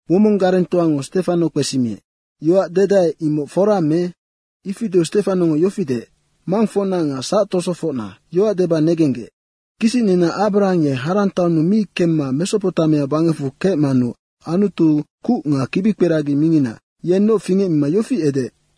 Womong garengtoango Stefano kpesimiec, “Yoac dedae, imoc fora me?” Ifi deu Stefanongo yofi deec, “Mangfocna nga sactosofocna, yoac deba negenggec: Kisicnina Abrahang ye Harang taonnu mi kemma Mesopotamia bangecfu kecmanu Anutu kuc nga kibikperagi mingina, yennoc fingecmima yofi edeec,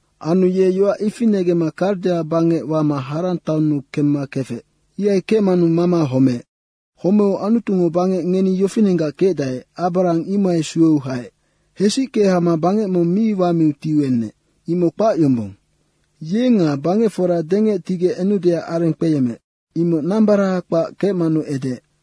Anu ye yoac ifi negemma Kardea bangec wama Harang taonnu kemma kefec. Ihai kecmanu mama homeec. Homeu Anutungo bangec ngeni yofinenggac kecdae, Abrahang imohai sueu haec. Hesicke hama bangec mong mi wamiu tiuenec, imoc kpac yombong. Ye nga bangecfora dengec tigec enudeac areng kpeyemmeec, imoc nambaraha kpac kecmanu edeec.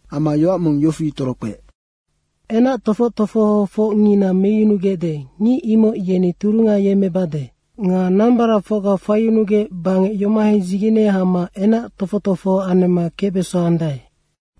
Amma yoac mong yofi torokpeec, ‘Enactofoc tofohofocngina meyunugecde, ngic imoc yeni turunga yemmebade nga nambaracfocga faiyunugec bangec yomohai dzigene hama enac tofoc tofoho anemma kecbesandae.’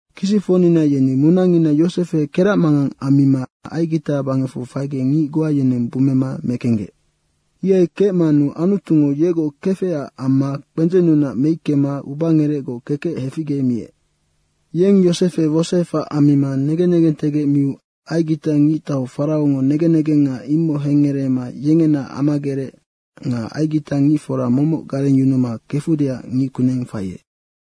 Kisicfocnina yeni munangina Yosefe keracmangang ammima Aigita bangecfu faigec ngic goa yeneng bummema mekenggec. Ihai kecmanu Anutungo yegoc kefecac amma kpendzennunac meickema ubangerecgoc kekec heficgemiec. Yeng Yosefe wosoefac ammima negen negentegec miu Aigita ngictau Faraongo negen negenga imoc hengngereema yengena amagerec nga aigitangicfora momoc garengyunuma kefudeac ngickuneng faiec.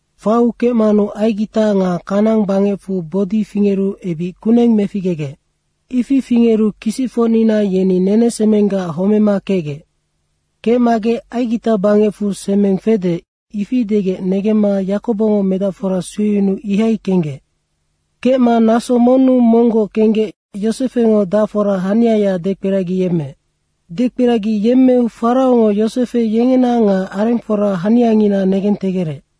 Faiu kecmanu Aigita nga Kanaang bangecfu bodi fingeru ebic kuneng meficgegec. Ifi fingeru kisicfocnina yeni nenesemenggac homema kecgec. Kecmagec ‘Aigita bangecfu semeng fede’ ifi degec negemma Yakobongo medacfora sueyunuu ihai kenggec. Kecma naso monnu monggoc kenggec Yosefengo dacfora haniaya dekperagiyemmeec. Dekperagiyemmeu Faraongo Yosefe yengena nga arengfora haniangina negentegerec.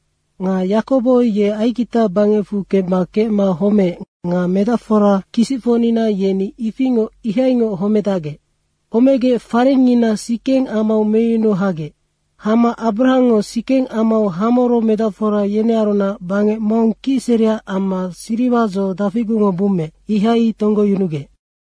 Nga Yakobo ye Aigita bangecfu kemma kecma homeec nga medacfora kisicfocnina yeni ifingoc ihaingoc homedacgec. Homegec farengngina Sikeng amau meyunu hagec. Hama Abrahangngo Sikeng amau Hamoro medacfora yenearunac bangec mong kicsereac amma siriwa dzo dafigucngo bummeec, imohai tonggoyunugec.”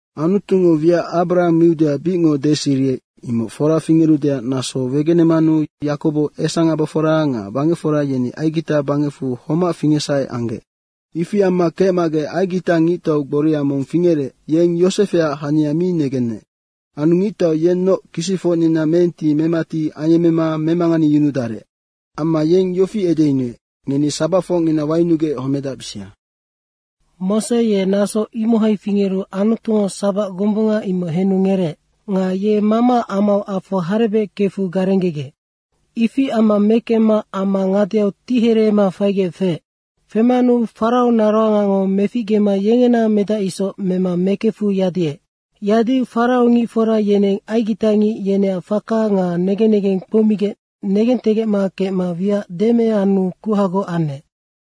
“Anutungo wiac Abrahang miudeac bicngoc deseriec, imoc fora fingerudeac naso wegenemanu Yakobo esangabofora nga bangecfora yeni Aigita bangecfu homac fingecsahe anggec. Ifi amma kecmagec Aigita ngictau gboria mong fingerec, yeng Yosefeac hania mi negenec. Anu ngictau yennoc kisicfocnina meenti memati ayemmema memanganeyunudarec. Amma yeng yofi edeyunuec, ‘Ngeni sabacfocngina wayunugec homedacbisia.’” “Mose ye naso imohai fingeru Anutungo sabac gombunga imoc henu ngereec. Nga ye mamaac amau afo harebec kefu garenggegec. Ifi amma mekemma ama ngadeau tihereema faigec feec. Femanu Farao naroangango meficgema yengena medac isoc mema mekefu yadiec. Yadiu Farao ngicfora yeneng aigitangic yeneac faka nga negen negeng kpoumigec negentegecma kecma wiac deme anu kuhagoc anec.”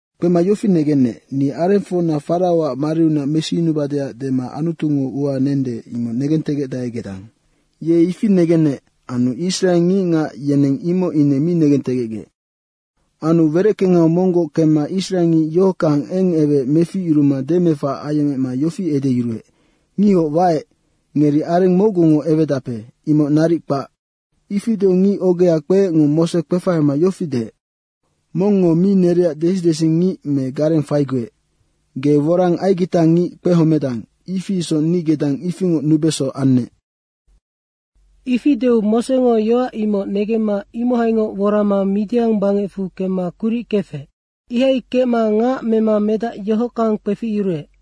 Kpema yofi negenec, ‘Ni arengfocna Faraoac mariunac mesiyunubadeac dema Anutungo ua nende, imoc negentegecdae gedang.’ Ye ifi negenec anu israe ngicngac yeneng imoc ine mi negentegecgec. Anu wereckengau monggoc kemma israengic yohockang eng eweec meficyuruma demefac ayecmema yofi edeyuruec, ‘Ngihoc waec, ngeri areng mocgungo ewedape, imoc naric kpac.’” “Ifi deu ngic ogea kpeecngo Mose kpefahama yofi deec, ‘Mongngo mi nereac desidesingic me gareng faiguec. Ge worang aigitangic kpehomedang, ifi isoc ni gedang ifingoc nubeso annec.’ Ifi deu Mosengo yoac imoc negemma imohaingoc worama Midiang bangecfu kemma kuric kefec. Ihai kecma ngac mema medac yohockang kpeficyuruec.”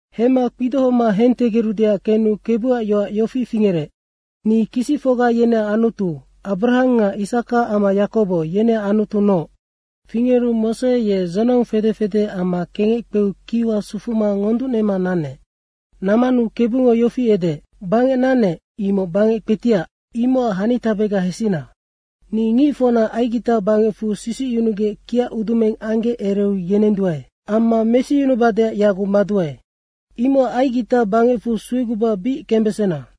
Hemma kpidohoma hentegerudeac kenu Kebuac yoac yofi fingerec, ‘Ni kisicfocga yeneac Anutu, Abrahang nga Isaka amma Yakobo, yeneac Anutunoc.’ Fingeru Mose ye dzonong fede fede amma kengec kpeu kiwa sufuma ngonducnema nanec. Nammanu Kebungo yofi edeec, ‘Bangec nannec, imoc bangec kpetiac, imocac hanitabega hesina. Ni ngicfocna Aigita bangecfu sisicyunugec kiacudumeng anggec ereu yenenduae. Amma mesiyunubadeac yaguc maduae. Imocac Aigita bangecfu sueguba bic kembesena.’”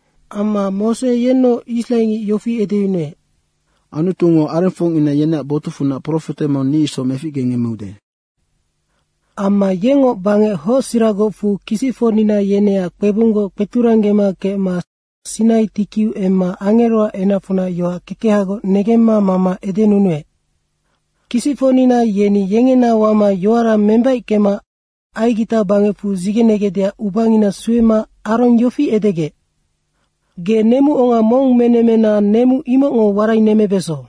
“Amma Mose yennoc israengic yofi edeyunuec, ‘Anutungo arengfocngina yeneac botucfunac profete mong ni isoc meficgengemmeude.’ Amma yengngoc bangec hocsiragocfu kisicfocnina yeneac kpebunggoc kpeturanggema kecma Sinai tikiu emma angeroac enacfunac yoac kekehagoc negemma mama edenunuec.” “Kisicfocnina yeni yengena wama yoara membaickema Aigita bangecfu dzigenegecdeac ubangina suema Arong yofi edegec, ‘Ge nemuonga mong menemmena nemu imocngo warainemmebeso.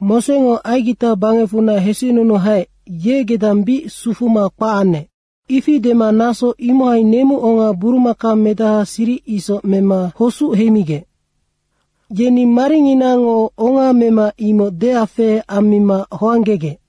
Mosengo Aigita bangecfunac hesicnunu haec, ye gedang bic sufuma kpac anec.’ Ifi dema naso imohai nemuonga burumaka medaha siric isoc mema hosuc heimigec. Yeni maringinango onga mema imoc deafehe ammima hoanggegec.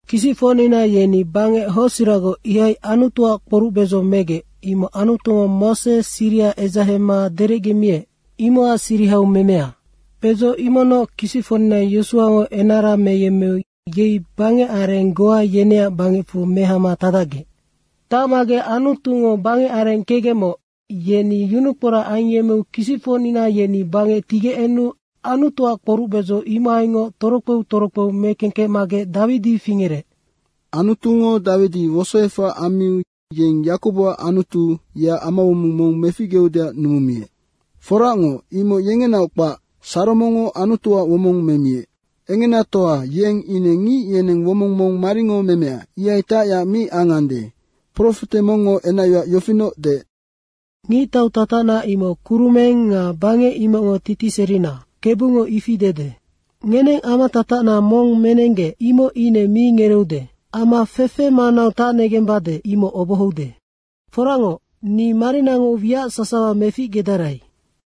“Kisicfocnina yeni bangec hocsiragoc, ihai Anutuac kporucbedzo megec, imoc Anutungo Mose siriha edzahema derecgemiec, imocac sirihau memea. Bedzo imocnoc kisicfocnina Yosuango enara meyemmeu yei bangecareng goa yeneac bangecfu mehama tacdacgec. Tacmagec Anutungo bangecareng kecgecmoc, yeni yunukporac ayemmeu kisicfocnina yeni bangec tigec enu Anutuac kporucbedzo imohaingoc torokpeu torokpe mekengkecmagec Dawidi fingerec.” “Anutungo Dawidi wosoefac ammiu yeng Yakoboac Anutu, yeac amawomong mong meficgeudeac numumiec. Foracngoc, imoc yengenaoc kpac, Saromongo Anutuac womong memiec. Engenatoa yeng ine ngic yeneng womong mong maringo memea, ihai tacyac mi angande. Profete mongngo enacyoac yofinoc deec, ‘Ngictau tatacna imoc kurumeng nga bangec imocngo titiserina, Kebungo ifi dede. Ngeneng amatatacna mong menenggec imoc ine mi ngereeude amma fefe monggac manau tacnegembade, imoc obohoude. Foracngoc, ni marinango wiac sasawa meficgedarai.’”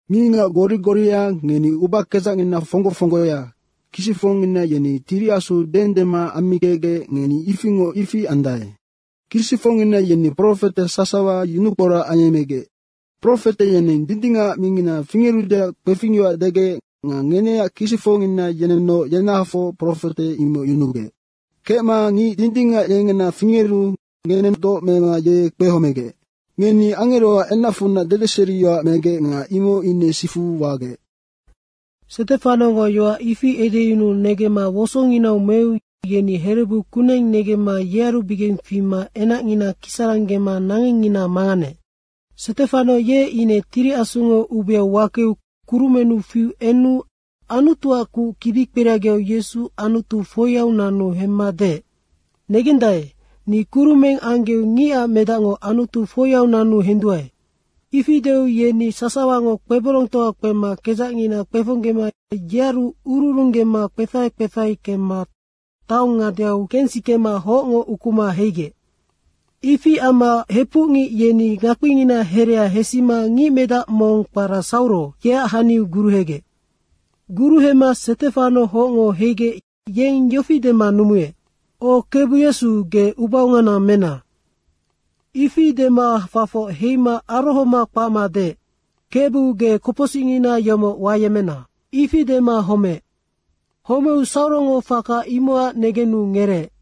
“Ngicngac gori goria, ngeni ubakedzacngina fonggo fonggoya, kisicfocngina yeni Tiri Asu deendema ammikecgec, ngeni ifingoc ifi andae. Kisicfocngina yeni profete sasawa yunukporac ayemmegec. Profete yeneng dindingac mingina fingerudeac kpefingyoac degec nga ngeneac kisicfocngina yenennoc yenahafoc profete imoc yunugec. Kecma Ngic Dindingac yengena fingeru ngenennoc doc mema ye kpehomegec. Ngeni angeroac enacfunac dedeseriyoac megec nga imoc ine sifu wagec.” Stefanongo yoac ifi edeyunuu negemma wosonginau meu yeni herebu kuneng negemma yearubigeng fima enacngina kisaranggema nangengngina manganeec. Stefano ye ine Tiri Asungo ubeau wakeu kurumennu fiu enu Anutuac kuc kibikperagiau Yesu Anutu foiau nanu hemma deec, “Negendae, ni kurumeng anggeu Ngicac Medacngo Anutu foiau nanu henduae.” Ifi deu yeni sasawango kpeborongtoa kpema kedzacngina kpefonggema yearu ururunggema kpefahe kpefahe kemma taong ngadeau kensikema hocngo ukuma heigec. Ifi amma hepucngic yeni ngakpingina herea hesima ngicmedac mong kpara Sauro, yeac haniu guruhegec. Guruhema Stefano hocngo heigec yeng yofi dema numuec, “O Kebu Yesu, ge ubaongana mena.” ifi dema fafoc heima arohoma kpacma deec, “Kebu ge kopocsicngina yomoc wayemmena.” ifi dema homeec. Homeu Saurongo faka imocac negenu ngereec.